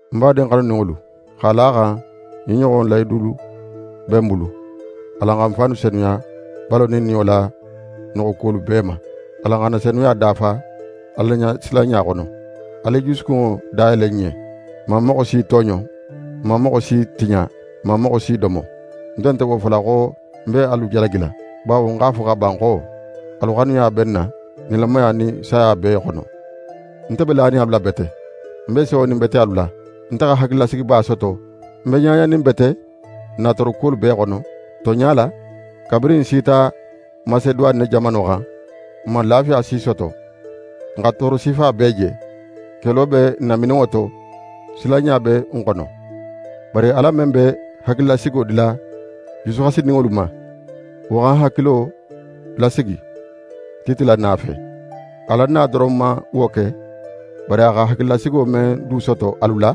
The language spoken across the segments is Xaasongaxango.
Ń badin xanuninŋolu, x'a la a xan ɲin ɲoxon lahidulu be n bulu, alan xa n fannu senuya balo nin niyo la noxokuwolu bee ma. Alan xa n na senuya dafa Alaɲasilanɲa xono. Alu i jusukunŋo dayele n ɲen. N man moxo si tooɲo. N man moxo si tiɲa. N man moxo si domo. Nte nte wo fola xo ń be alu jalagila. Bawo ń x'a fo xa ban xo, alu xanuya be n na, nilamaya nin saya bee xono. Nte be lanin alu la bete! Nte be sewonin bete alu la. Nte xa hakililasigiba soto, ń be ɲaɲanin bete n na toorokuwolu bee xono. Tonɲa la, kabirin n sita Maseduwane jamano xan, n man lafiya si soto. N xa tooro sifa bee je. Kelo be n namininŋo to, silanɲa be n xono. Bari Ala men be hakililasigo dila jusuxasininŋolu ma, wo xa n hakilo lasigi Tite la na fe. A la na doron man wo ke, bari a xa hakililasigo men du soto alu la.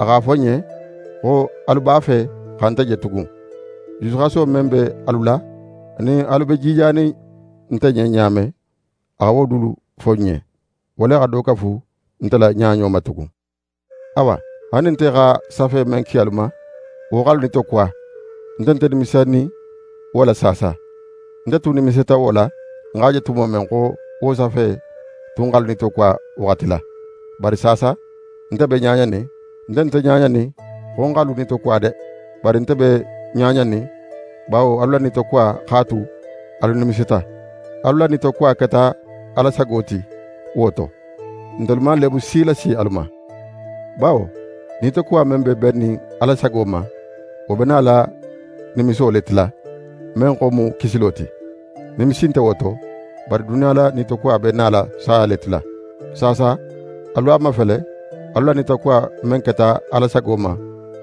A x'a fo n ɲen xo alu b'a fe xa nte je tugun. Jusuxaso men be alu la, anin alu be jijanin nte ɲen ɲa men, a xa wo dulu fo n ɲen. Wo le xa do kafu nte la ɲaɲo ma tugun. Awa, haali nin nte xa safe men ki alu ma, wo x'alu nitokuwa, nte nte nimisinin wo la saasa. Nte tun nimisita wo la, ń x'a je tumo men xo wo safe tun x'alu nitokuwa waxati la. Bari saasa, nte be ɲaɲanin. Nte nte ɲaɲanin xo ń x'alu nitokuwa de, bari nte be ɲaɲanin bawo alu la nitokuwa x'a tu alu nimisita. Alu la nitokuwa keta Ala sago ti, wo to, ntelu man leebu si lasi alu ma. Bawo nitokuwa men be bennin Ala sago ma, wo be nala nimiso le tila, men xo mu kisilo ti. Nimisi nte wo to. Bari duniya la nitokuwa be nala saya le tila. Saasa, alu a mafele alu la nitokuwa men keta Ala sago ma,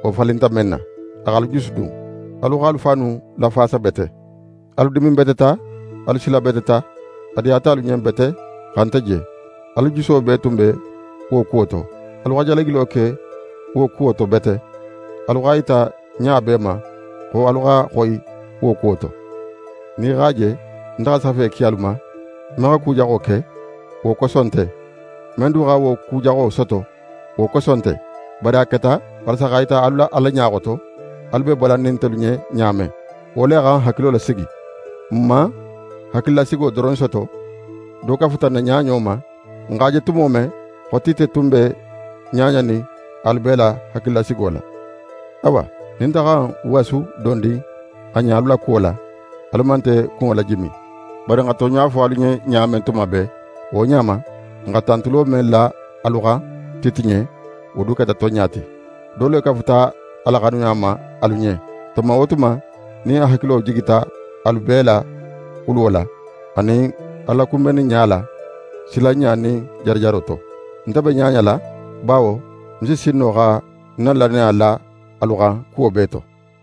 wo falinta men na: A x'alu jusudun. Alu x'alu fannu lafaasa bete. Alu diminbeteta, alu silabeteta, a diyata alu ɲen bete xa nte je. Alu juso bee tun be wo kuwo to. Alu xa jalagilo ke wo kuwo to bete. Alu x'a yita ɲa bee ma xo alu xa xoyi wo kuwo to. Nin í x'a je nte xa safe ki alu ma, men xa ku jaxo ke, wo koso nte, men du xa wo ku jaxo soto, wo koso nte. Bari a keta walasa x'a yita alu la Ala ɲa xoto, alu be balannin ntelu ɲen ɲa men. Wo le xa n hakilo lasigi. N man hakililasigo doron soto, do kafuta n na ɲaɲo ma, n x'a je tumo men xo Tite tun be ɲaɲanin alu bee la hakililasigo la. Awa, nin nte xa ń wasu dondin a ɲen alu la kuwo la, alu man nte kunŋo lajimi. Bari n xa tonɲa fo alu ɲen ɲa men tuma bee, wo ɲa ma, n xa tantulo men la alu xan Tite ɲen, wo du keta tonɲa ti. Do le kafuta a la xanuya ma alu ɲen, tuma wo tuma nin a hakilo jigita alu bee la xuluwo la, anin alu la kunbenniɲa la, silanɲa nin jarajaro to. Nte be ɲaɲala bawo ń si sin no xa ń na lannaya la alu xan kuwo bee to.